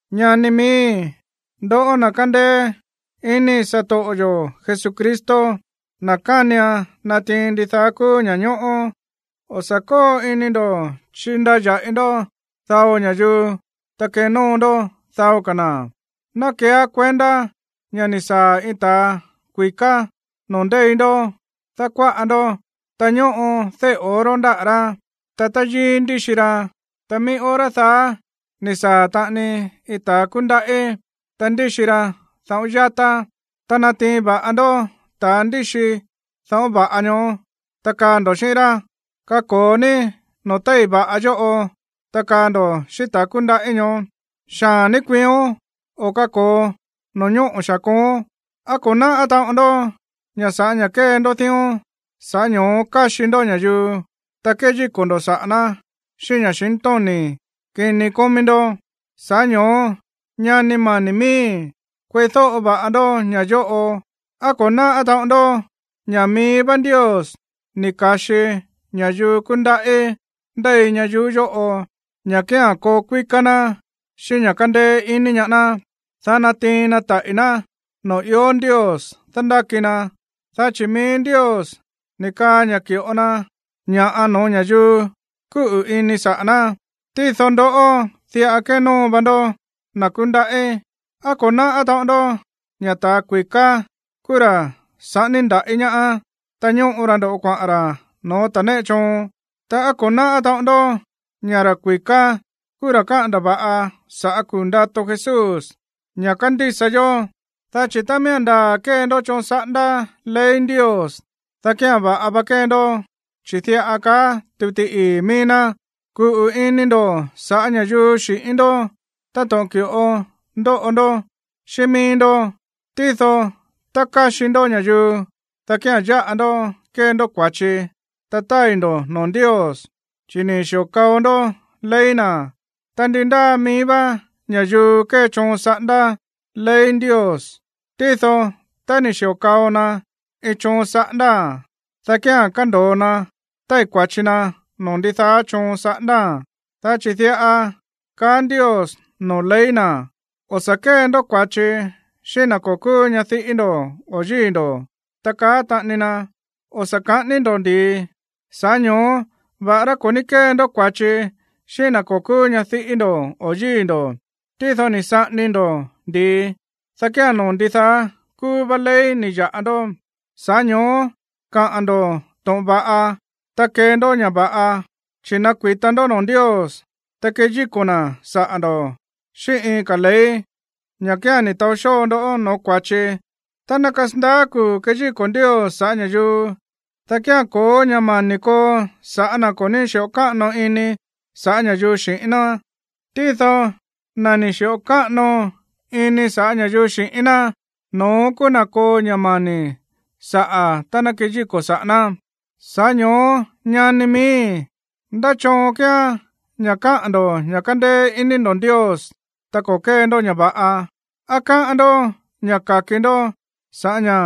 Ñani miíi̱, ndoꞌó na̱ kándéé iní satoꞌo yo̱ Jesucristo, na̱ kánian natiin ndidaá kúú ña̱ñóꞌó, o̱ sa̱ kóo ini ndo̱ chindaya̱ꞌi ndó dao ña̱yuu, ta kenóo ndó dao ka̱ na̱. Ná keeá kuendá ña̱ ni̱ saa̱ iin ta̱a kui̱ká noo̱ ndéi ndó dákuáꞌa ndó, ta ñóꞌo déꞌe̱ oro ndáꞌa̱ rá, ta táyíí ndíxi ra. Ta mií hora daá ni̱ saa̱ taꞌani iin ta̱a kúndaꞌí, ta ndíxi ra dáꞌo̱n yatá. Ta nátiin va̱ꞌa ndó ta̱ ndíxi dáꞌo̱n va̱ꞌa ñoó, ta kaá ndo̱ xíꞌín rá: “Kako̱o ní noo̱ téi̱ va̱ꞌa yóꞌo.” Ta kaá ndo̱ xíꞌín ta̱ kúndaꞌí ñoó: “Xaa̱n ní kuiión, o kako̱o no̱ñóꞌo̱ xaa̱n kooón.” ¿Á ko̱ náꞌá taꞌon ndó ña̱ sa̱ꞌá ña̱ kée ndó dión, sa̱ꞌá ño̱ó káxi ndó ña̱yuu, ta kéyíko̱ ndo̱ saꞌa̱ ná xíꞌín ña̱xintóni̱ kini kómí ndó? Sa̱ꞌá ño̱ó, ñani mani̱ miíi̱, kueídóꞌo va̱ꞌa ndó ña̱ yóꞌo. ¿Á ko̱ náꞌá taꞌon ndó ña̱ mií vá Ndios ni̱ ka̱xi ña̱yuu kúndaꞌí ndéi ñayuú yóꞌo ña̱ kía̱n koo kuíká ná xíꞌín ña̱ kándéé iní ñaá ná, dá natiin na taꞌi̱ ná noo̱ ió Ndios dándáki na, dá chi̱ mií Ndios ni̱ kaa ña̱ ki̱ꞌo na ña̱ no̱ó ña̱yuu kúꞌu̱ ini na̱ saꞌa̱ ná? Tído ndoꞌó, diꞌa kénóo va ndó na̱ kúndaꞌí. ¿Á ko̱ náꞌá taꞌon ndó ña̱ ta̱ kui̱ká kúú ra̱ saꞌání ndaꞌí ñaá, ta ñóꞌo ra ndo̱ꞌó kuaꞌa̱n ra̱ no̱ó ta̱ néꞌe choon? Ta, ¿á ko̱ náꞌá taꞌon ndó ña̱ ta̱ kui̱ká kúú ra̱ káꞌa̱n ndava̱ꞌa sa̱ꞌá kuu̱ ndato Jesús, ña̱ kándísa yó? Dá chi̱ tá miía̱n ndaa̱ kée ndó choon saꞌándá ley Ndios, dá kía̱n va̱ꞌa va kée ndó. Chi̱ diꞌa káꞌa̱n tuti ii̱ mií ná: “Kuꞌu̱ ini ndo̱ sa̱ꞌá ña̱yuu xi̱ꞌín ndó táto̱ꞌon ki̱ꞌo ndóꞌo ndó xíꞌín mií ndó.” Tído tá káxi ndó ña̱yuu, dá kía̱n yáꞌa ndó kée ndó kua̱chi, ta tái̱ ndo̱ noo̱ Ndios, chi̱ ni̱ xi̱o kao ndó ley na̱. Ta ndi ndáa mií vá ña̱yuu kée choon saꞌándá ley Ndios, tído tá ni̱ xi̱o kao na iin choon saꞌándáa̱n, dá kía̱n kándo̱o na tái̱ kua̱chi na noo̱ ndidaá choon saꞌándáa̱n. Dá chi̱ diꞌa kaá Ndios noo̱ ley na̱: “O̱ sa̱ kée ndó kua̱chi xíꞌín na̱ ko̱ kúú ñadiꞌí ndo̱ o̱ yíi̱ ndo̱.” Ta kaá taꞌani na: “O̱ sa̱ kaꞌání ndó ndi̱i.” Sa̱ꞌá ño̱ó va̱ꞌará ko̱ ní kée ndó kua̱chi xíꞌín na̱ ko̱ kúú ñadiꞌí ndo̱ o yíi̱ ndo̱, tído ni̱ saꞌání ndó ndi̱i, dá kía̱n noo̱ ndidaá kúú vá ley ni̱ ya̱ꞌa ndó. Sa̱ꞌá ño̱ó kaꞌa̱n ndo̱ to̱ꞌon va̱ꞌa, ta kee ndó ña̱ va̱ꞌa, chi̱ nakui̱ta ndó noo̱ Ndios, ta keyíko̱ na̱ saꞌa̱ ndo̱ xíꞌín iin ka̱ ley, ña̱ kía̱n ni̱ taó xóo ndó no̱ó kua̱chi. Tá ná kasandaá kuu̱ keyíko̱ Ndios sa̱ꞌá ña̱yuu, dá kía̱n ko̱ó ña̱ mani̱ koo sa̱ꞌá na̱ ko̱ ní xi̱ꞌo káꞌano ini sa̱ꞌá ña̱yuu xi̱ꞌín ná. Tído na̱ ni̱ xi̱ꞌo káꞌano ini sa̱ꞌá ña̱yuu xi̱ꞌín ná, no̱ón kúú na̱ koo ña̱ mani̱ saꞌa̱ tá ná keyíko̱ saꞌa̱ ná. Sa̱ꞌá ño̱ó ñani miíi̱, ¿ndá choon kíán ña̱ kaá ndo̱ ña̱ kándéé iní ndo̱ Ndios tá ko̱ kée ndó ña̱ va̱ꞌa? ¿Á káꞌán ndó ña̱ ka̱ki ndó sa̱ꞌá ña̱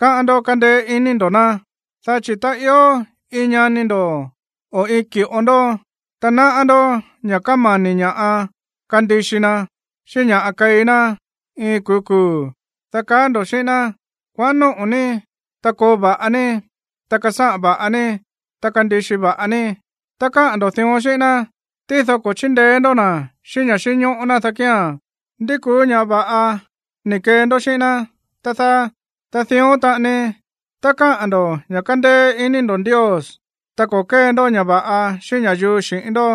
kaá ndo̱ kándéé iní ndo̱ ná? Dá chi̱ tá ió iin ñani ndo̱, o iin ki̱ꞌo ndó, ta náꞌá ndó ña̱ kámani̱ ña̱ꞌa kandixi na, xíꞌín ña̱ꞌa keí ná iin iin kuu̱ kuu̱, dá kaá ndo̱ xíꞌín ná: “Kuaꞌán nóꞌo̱ ní, ta koo va̱ꞌa ní, ta kasáꞌan va̱ꞌa ní, ta kandixi va̱ꞌa ní.” Tá kaá ndo̱ dión xíꞌín ná, tído ko̱ chíndeé ndó na̱ xíꞌín ña̱ xínñóꞌó ná, dá kía̱n, ¿ndi kúú ña̱ va̱ꞌa ni̱ kee ndó xíꞌín ná, tá dáá? Dión taꞌani, tá kaá ndo̱ ña̱ kándéé iní ndo̱ Ndios, ta ko̱ kée ndó ña̱ꞌa va̱ꞌa xíꞌín ña̱yuu xi̱ꞌín ndó,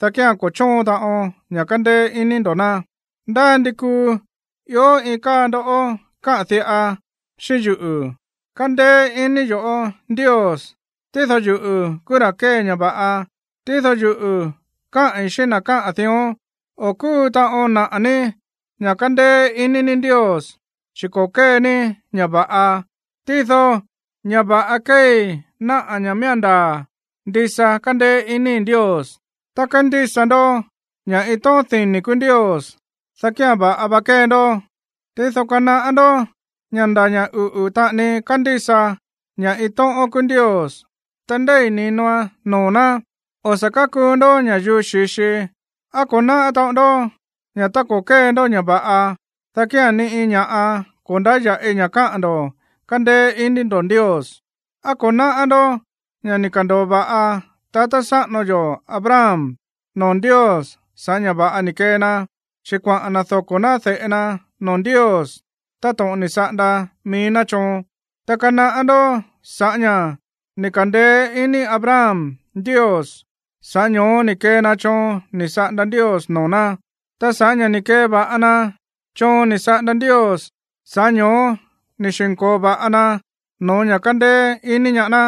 dá kía̱n ko̱ chóon taꞌon ña̱ kándéé iní ndo̱ ná. Ndá ndi kuu ió iin káa ndó kaa diꞌa xíꞌín yuꞌu̱: “Kándéé iní yo̱ꞌó Ndios, tído yuꞌu̱ kúú ra̱ kée ña̱ va̱ꞌa.” Tído yuꞌu̱ kaái̱ xíꞌín na̱ káꞌa̱n dión: “O̱ kúu taꞌon naꞌa̱ ní ña̱ kándéé iní ní Ndios, chi̱ ko̱ kée ní ña̱ va̱ꞌa. Tído ña̱ va̱ꞌa kéei náꞌa̱ ña̱ miía̱n ndaa̱ ndisa kándéé iníi̱ Ndios.” Tá kándísa ndó ña̱ iin tóꞌón dini̱ kúú Ndios, dá kía̱n va̱ꞌa va kée ndó. Tído kanaꞌá ndó ña̱ nda̱ ña̱ uꞌu̱ taꞌani kándísa ña̱ iin tóꞌón kúú Ndios, ta ndéi̱ ni̱noan noo̱ ná. O̱ sa̱ kákuu ndó ña̱yuu xi̱xi. ¿Á ko̱ náꞌá taꞌon ndó ña̱ tá ko̱ kée ndó ña̱ va̱ꞌa, dá kía̱n ni iin ña̱ꞌa ko̱ ndáya̱ꞌi ña̱ kaá ndo̱ kándéé iní ndo̱ Ndios? ¿Á ko̱ náꞌá ndó ña̱ ni̱ ka̱ndo̱o va̱ꞌa tatá sáꞌano yo̱ Abraham noo̱ Ndios sa̱ꞌá ña̱ va̱ꞌa ni̱ kee na, chi̱ kuaꞌa̱n na̱ doko̱ ná de̱ꞌe na noo̱ Ndios táto̱ꞌon ni̱ saꞌanda mií ná choon? Ta kanaꞌá ndó ña̱ sa̱ꞌá ña̱ ni̱ ka̱ndeé iní Abraham Ndios, sa̱ꞌá ño̱ó ni̱ kee na choon ni̱ saꞌanda Ndios noo̱ ná. Ta sa̱ꞌá ña̱ ni̱ keva̱ꞌa na choon ni̱ saꞌanda Ndios, sa̱ꞌá ño̱ó ni̱ xi̱nko̱o va̱ꞌa na no̱ó ña̱ kándéé iní ñaá ná.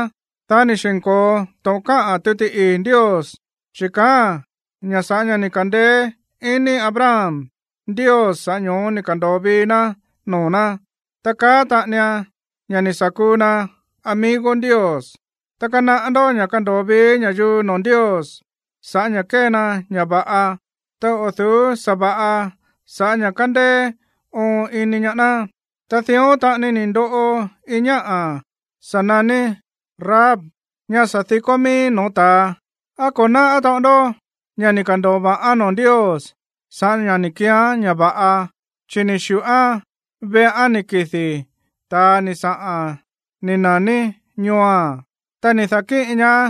Dá ni̱ xi̱nko̱o to̱ꞌon káꞌa̱n tuti ii̱ Ndios, chi̱ kaáa̱n ña̱ sa̱ꞌá ña̱ ni̱ ka̱ndeé iní Abraham Ndios, sa̱ꞌá ño̱ó ni̱ ka̱ndo̱o vii ná noo̱ ná. Ta káꞌa̱n taꞌanian ña̱ ni̱ sa̱ kuu na amigo Ndios. Ta kanaꞌá ndó ña̱ kándo̱o vii ña̱yuu noo̱ Ndios sa̱ꞌá ña̱ kée na ña̱ va̱ꞌa, ta o̱ du̱ú sa̱va̱ꞌa sa̱ꞌá ña̱ kándéé óon iní ñaá ná. Ta dión taꞌani ni̱ ndoꞌo iin ñáꞌa̱ sa̱ naní Rahab, ñá sa̱ di̱kó mií no̱ó ta̱a. ¿Á ko̱ náꞌá taꞌon ndó ña̱ ni̱ ka̱ndo̱o va̱ꞌán noo̱ Ndios sa̱ꞌá ña̱ ni̱ keeán ña̱ va̱ꞌa, chi̱ ni̱ xi̱ꞌoán veꞌán ni̱ kidi̱ ta̱a ni̱ saꞌa̱n ni̱ na̱ní ñooa̱n, ta ni̱ da̱kíꞌin ñaá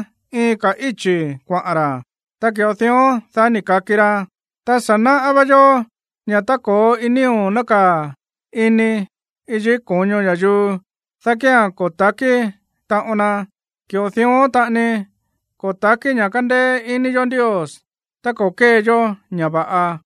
iin ka̱ íchi̱ kuaꞌa̱n ra̱? Ta ki̱ꞌo dión, dá ni̱ ka̱ki ra. Ta sa̱ náꞌá vá yó ña̱ tá ko̱ó nío̱ nákaa̱ ini yikí ko̱ño iin ña̱yuu, dá kía̱n ko̱ ta̱kí taꞌon na. Ki̱ꞌo dión taꞌani ko̱ ta̱kí ña̱ kándéé iní yo̱ Ndios tá ko̱ kée yó ña̱ va̱ꞌa.